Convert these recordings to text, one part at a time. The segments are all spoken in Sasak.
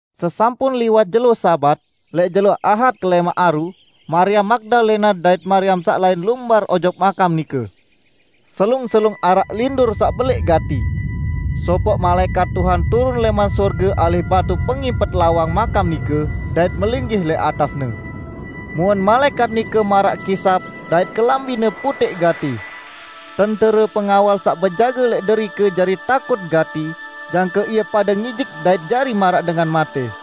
Sesampun liwat jelo Sabat, lẽq jelo Ahad kelẽmaq aru, Mariam Magdalena dait Mariam saq lain lumbar ojok makam nike. Selung-selung araq lindur saq belẽq gati. Sopoq malaẽkat Tuhan turun lẽman sorge alih batu pengimpet lawang makam nike dait melinggih lẽq atasne. Muen malaẽkat nike maraq kisap dait kelambine putẽq gati. Tentere pengawal saq bejage lẽq derike jari takut gati jangke ie pade ngijik dait jari maraq dengan matẽ.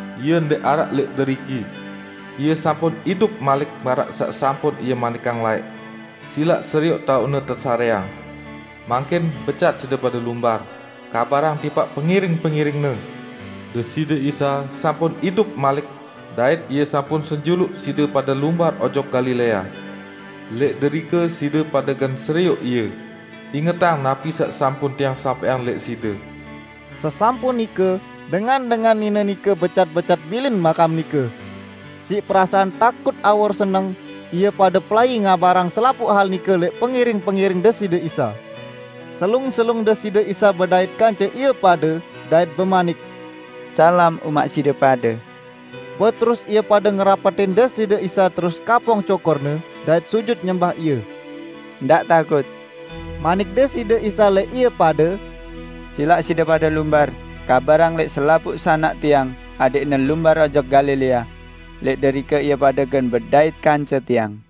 Ie ndẽq araq lẽq deriki. Ie sampun idup malik maraq saq sampun Ie manikang laẽq. Silaq serioq taoq-Ne tesarẽang. Mangkin, becat side pade lumbar, kabarang tipaq pengiring-pengiring-Ne, 'Deside Isa sampun idup malik, dait Ie sampun senjuluq side pade lumbar ojok Galilea. Lẽq derike side pade gen serioq Ie!' Ingetang napi saq sampun tiang sampẽang lẽq side." Sesampun nike, dengan-dengan nine nike becat-becat bilin makam nike. Siq perasaan takut awor seneng ie pade pelai ngabarang selapuq hal nike lẽq pengiring-pengiring Deside Isa. Selung-selung Deside Isa bedait kance ie pade, dait bemanik, "Salam umaq side pade!" Beterus ie pade ngerapetin Deside Isa terus kapong cokor-Ne dait sujut nyembah Ie. "Ndaq takut," manik Deside Isa lẽq ie pade, "silaq side pade lumbar kabarang lẽq selapuq sanak Tiang adẽqne lumbar ojok Galilea. Lẽq derike ie pade gen bedait kance Tiang."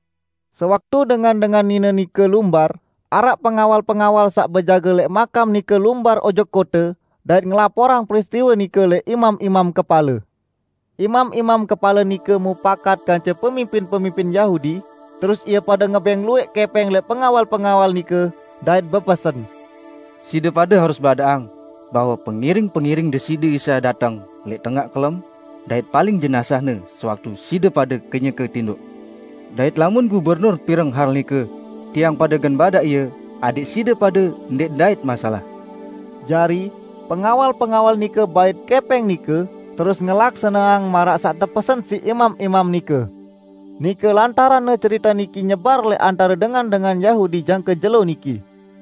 Sewaktu dengan-dengan nine nike lumbar, araq pengawal-pengawal saq bejage lẽq makam nike lumbar ojok kote, dait ngelaporang peristiwe nike lẽq imam-imam kepale. Imam-imam kepale nike mupakat kance pemimpin-pemimpin Yahudi, terus ie pade ngebẽng luwẽq kẽpẽng lẽq pengawal-pengawal nike, dait bepesen, "Side pade harus badaqang bahwe pengiring-pengiring Deside Isa dateng lẽq tengaq kelem dait paling jenazah-Ne sewaktu side pade kenyeke tindoq. Dait lamun gubernur pireng hal nike, tiang pade gen badaq ie adẽq side pade ndẽq ndait masalah." Jari, pengawal-pengawal nike bait kẽpẽng nike, terus ngelaksaneang maraq saq tepesen siq imam-imam nike. Nike lantaranne cerite niki nyebar lẽq antare dengan-dengan Yahudi jangke jelo niki.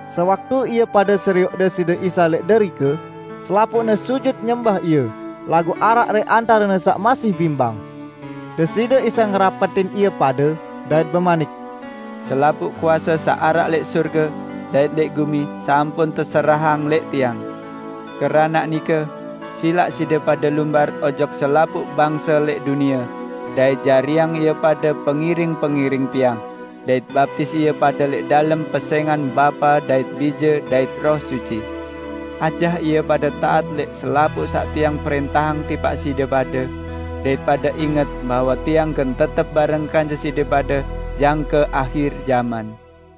Sewaktu ie pade serioq Deside Isa lẽq derike, selapuqne sujut nyembah Ie, laguq araq lẽq antarene saq masih bimbang. Deside Isa ngerapetin ie pade, dait bemanik, "Selapuq kuase saq araq lẽq sorge dait lẽq gumi sampun teserahang lẽq Tiang. Keranaq nike, silaq side pade lumbar ojok selapuq bangse lẽq dunie, dait jariang ie pade pengiring-pengiring Tiang, dait baptis ie pade lẽq dalem pesẽngan Bapa dait Bije dait Roh Suci. Ajah ie pade taat lẽq selapuq saq Tiang prẽntahang tipaq side pade. Dait pade inget bahwe Tiang gen tetep bareng kance side pade jangke ahir jaman."